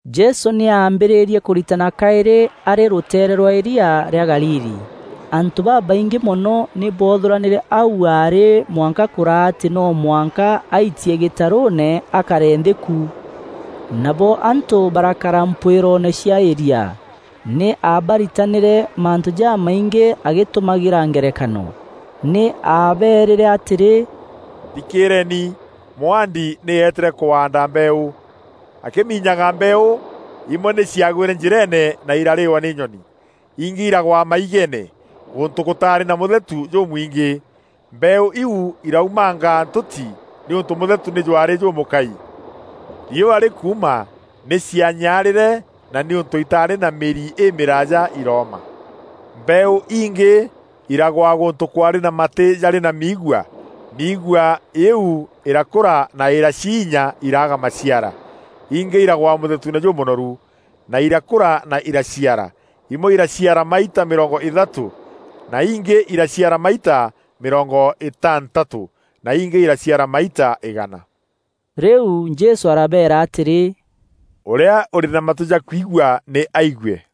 Jesû nî aambîrîrie kûritana kaîrî arî rûteere rwa îria rîa Galili. Antû babaingî mono nî boothûranîre au aarî mwanka kûraa atî no mwanka aitie gîtarûûne akare nthî ku. Nabo antû barakara mpwîroone cia îria. Nî aabaritanîre mantû jamaingî agîtumagîra ngerekano. Nî aabeerîre atîrî, “Thikîîreeni! Mwaandi nî eetîre kwaanda mbeeû. Akîminyaga mbeeû, imwe nî ciagwîre njîreene na irarîîwa nî nyoni. Ingî iragwa maigeene, gûntû gûtaarî na mûthetu jûmwingî. Mbeeû iu iraumanga ntûti nîûntû mûthetu jwaarî jûmûkai. Riûa rîkuuma nî cianyaarîre na nîûntû itaarî na mîri îmîraaja irooma. Mbeeû ingî iragwa gûntû kwaarî na matî jarî na miigua. Miigua îîu îrakûra na îraciinya, iraaga maciara. Ingî iragwa mûthetuune jûmûnoru, na irakûra na iraciara: imwe iraciara maita mîrongo îthatû, na ingî iraciara maita mîrongo intantatû, na ingî iraciara maita îgana.” Rîu Jesû arabeera atîrî, “Ûrîa ûrî na matû ja kwigua nî aigue.”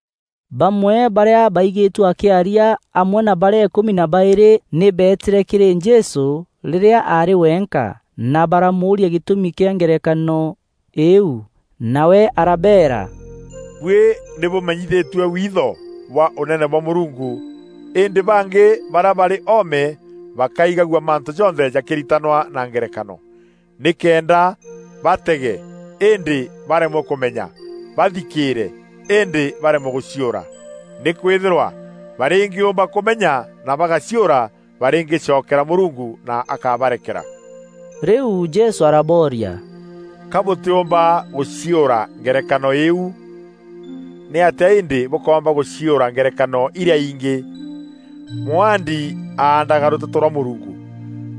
Bamwe barîa baigîtue akîaria, amwe na barîa îkûmi na baîrî nî beetîre kîrî Jesû rîrîa aarî wenka, na baramûûria gîtûmi kîa ngerekano îîu. Nawe arabeera, “Buî nî bûmenyithîtue witho bwa Ûnene bwa Mûrungu, îndî bangî barîa barî oome bakaigagua mantû jonthe jakîritanwa na ngerekano, nîkenda, ‘Batege, îndî baremwe kûmenya, bathikîîre, îndî baremwe gûciûra. Nîkwîthîrwa barîngîûmba kûmenya na bagaciûra, barîngîcokera Mûrungu na akabarekera.’” Rîu Jesû arabooria, “Ka bûtîûmba gûciûra ngerekano îîu? Nîatîa îndî bûkoomba gûciûra ngerekano irîa ingî? Mwaandi aandaga rûteto rwa Mûrungu.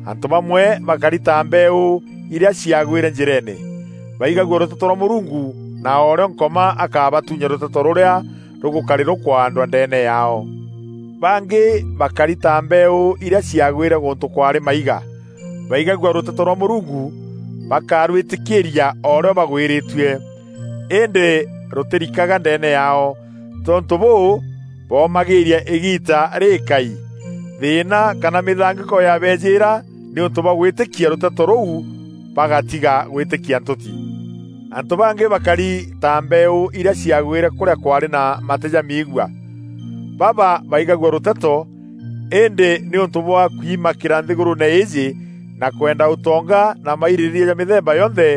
Antû bamwe bakari ta mbeeû iria ciagwîre njîreene. Baigagua rûteto rwa Mûrungu na o rîo Nkoma akabatuunya rûteto rûrîa rûgûkarî rûkwaandwa ndeene yaao. Bangî bakari ta mbeeû irîa ciagwîre gûntû kwaarî maiga. Baigagua rûteto rwa Mûrungu, bakarwîtîkîîria o rîo bagwîrîtue, îndî rûtîrikaga ndeene yaao. Tontû bûû, boomagîria îgiita rîîkaî. Thîîna kana mîthangîko yaabeejîra nîûntû bwa gwîtîkia rûteto rûu bagatiga gwîtîkia ntûti. Antû bangî bakari ta mbeeû irîa ciagwîre kûrîa kwaarî na matî ja miigua. Baba baigagua rûteto îndî nîûntû bwa kwimakîra nthîgûrûûne îîjî, na kwenda ûtonga na mairîrîîria ja mîthemba yonthe,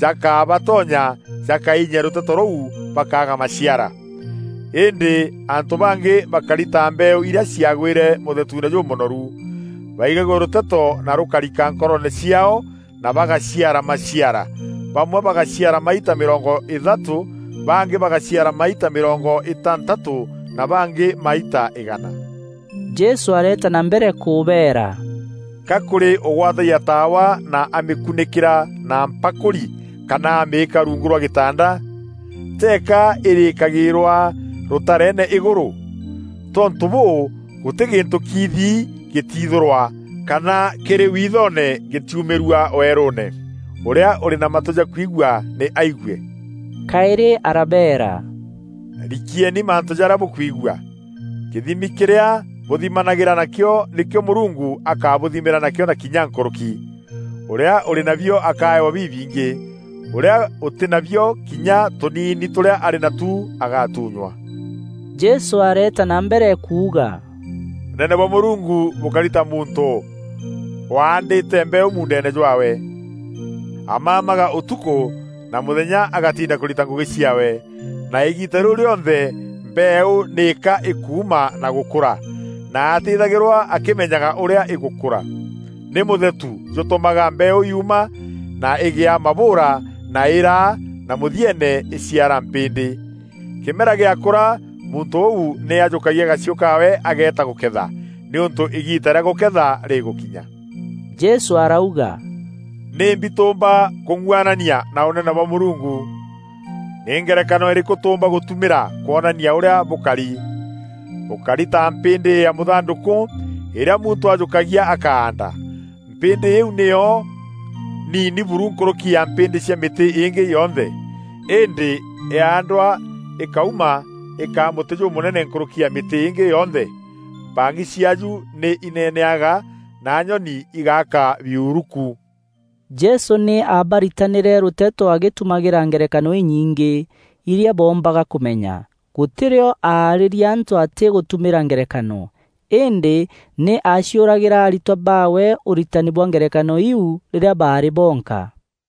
jakabatonya jakaiinya rûteto rûu bakaaga maciara. Îndî antû bangî bakari ta mbeeû irîa ciagwîre mûthetuune jûmûnoru. Baigagua rûteto na rûkarika nkoroone ciaao na bagaciara maciara: bamwe bagaciara maita mîrongo îthatû, bangî bagaciara maita mîrongo îtantatû, na bangî maita îgana.” Jesû areeta na mbere kûbeera, “Ka kûrî ûgwatagia taawa na amîkunîkîra na mpakûri kana amîîka rungu rwa gîtanda? Teeka îrîîkagîîrwa rûtareene îgûrû? Tontû bûû, gûtî gîntû kiithi gîtiithûrwa kana kîrî withoone gîtiumîrua weerûûne. Ûrîa ûrî na matû ja kwigua nî aigue!” Kaîrî arabeera, “Rikieni mantû jarîa bûkwigua! Kîthimi kîrîa bûthimanagîra na kîo, nîkîo Mûrungu akabûthimîra nakîo na kinya nkûrûki. Ûrîa ûrî nabio akaewa bibingî; ûrîa ûtî nabio, kinya tûniini tûrîa arî natu agatunywa.” Jesû areeta na mbere kuuga, “Ûnene bwa Mûrungu bûkari ta muntû waandîte mbeeû muundeene jwaawe. Amamaga ûtukû na mûthenya agatinda kûrita ngûgî ciaawe, na îgiita rîu rîonthe mbeeû nîka îkuuma na gûkûra, na atîîthagîrwa akîmenyaga ûrîa îgûkûra. Nî mûthetu jûtûmaga mbeeû yuuma na îgîa mabûûra na îraa na mûthieene îciara mpîndî. Kîmera gîakûra, muntû ûu nî ajûkagia gachiû kaawe ageeta gûketha, nîûntû îgiita rîa gûketha rîgûkinya.” Jesû arauga, “Nîmbi tûûmba kûng'uanania na Ûnene bwa Mûrungu? Nî ngerekano îrîkû tûûmba gûtumîra kwonania ûrîa bûkari? Bûkari ta mpîndî ya mûthandûkû îrîa muntû ajûkagia akaanda. Mpîndî îîu nîyo niini buru nkûrûki ya mpîndî cia mîtî îngî yonthe. Îndî yaandwa îkauma îkaa mûtî jûmûnene nkûrûki na mîtî îngî yonthe. Mpang'i ciaaju nî ineneaga na nyoni igaaka biuru ku.” Jesû nî aabaritanîre rûteto agîtumagîra ngerekano inyingî, irîa boombaga kûmenya. Gûtî rîo aarîria antû atî gûtumîra ngerekano. Îndî nî aaciûragîra aritwa baawe ûritani bwa ngerekano iu rîrîa barî bonka.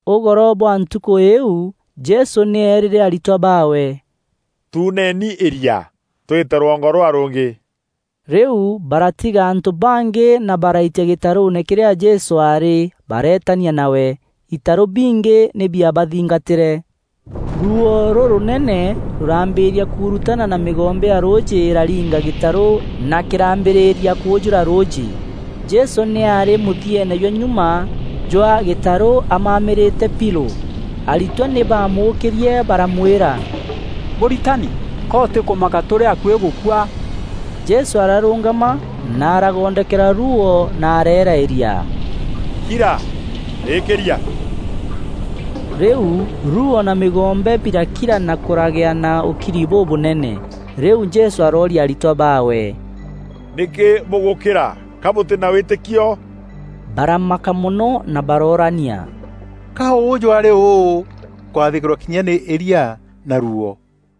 Ûgoro bwa ntukû îîu, Jesû nî eerîre aritwa baawe, “Tuuneni îria, twîte rwongo rûrîa rûngî.” Rîu baratiga antû bangî na baraitia gîtarûûne kîrîa Jesû aarî bareetania nawe. Itarû bingî nî biabathingatîre. Ruuo rûrûnene rûraambîria kurutana na mîgombe ya rûûjî îraringa gîtarû na kîrambîrîria kûûjûra rûûjî. Jesû nî aarî mûthieene jwa nyuma jwa gîtarû amamîrîte pilû. Aritwa nî baamûkîrie baramwîra, “Mûritani, ka ûtîkûmaka tûrî akuî gûkua?” Jesû ararûngama na aragondokera ruuo na areera îria, “Kira! Rîkîria!” Rîu ruuo na mîgombe birakira na kûragea na ûkiri bûbûnene. Rîu Jesû arooria aritwa baawe, “Nîkî bûgûkîra? Ka bûtî na wîtîkio?” Baramaka mono na baroorania, “Ka ûjû arî ûû ûkwathîkîrwa kinya nî îria na ruuo?”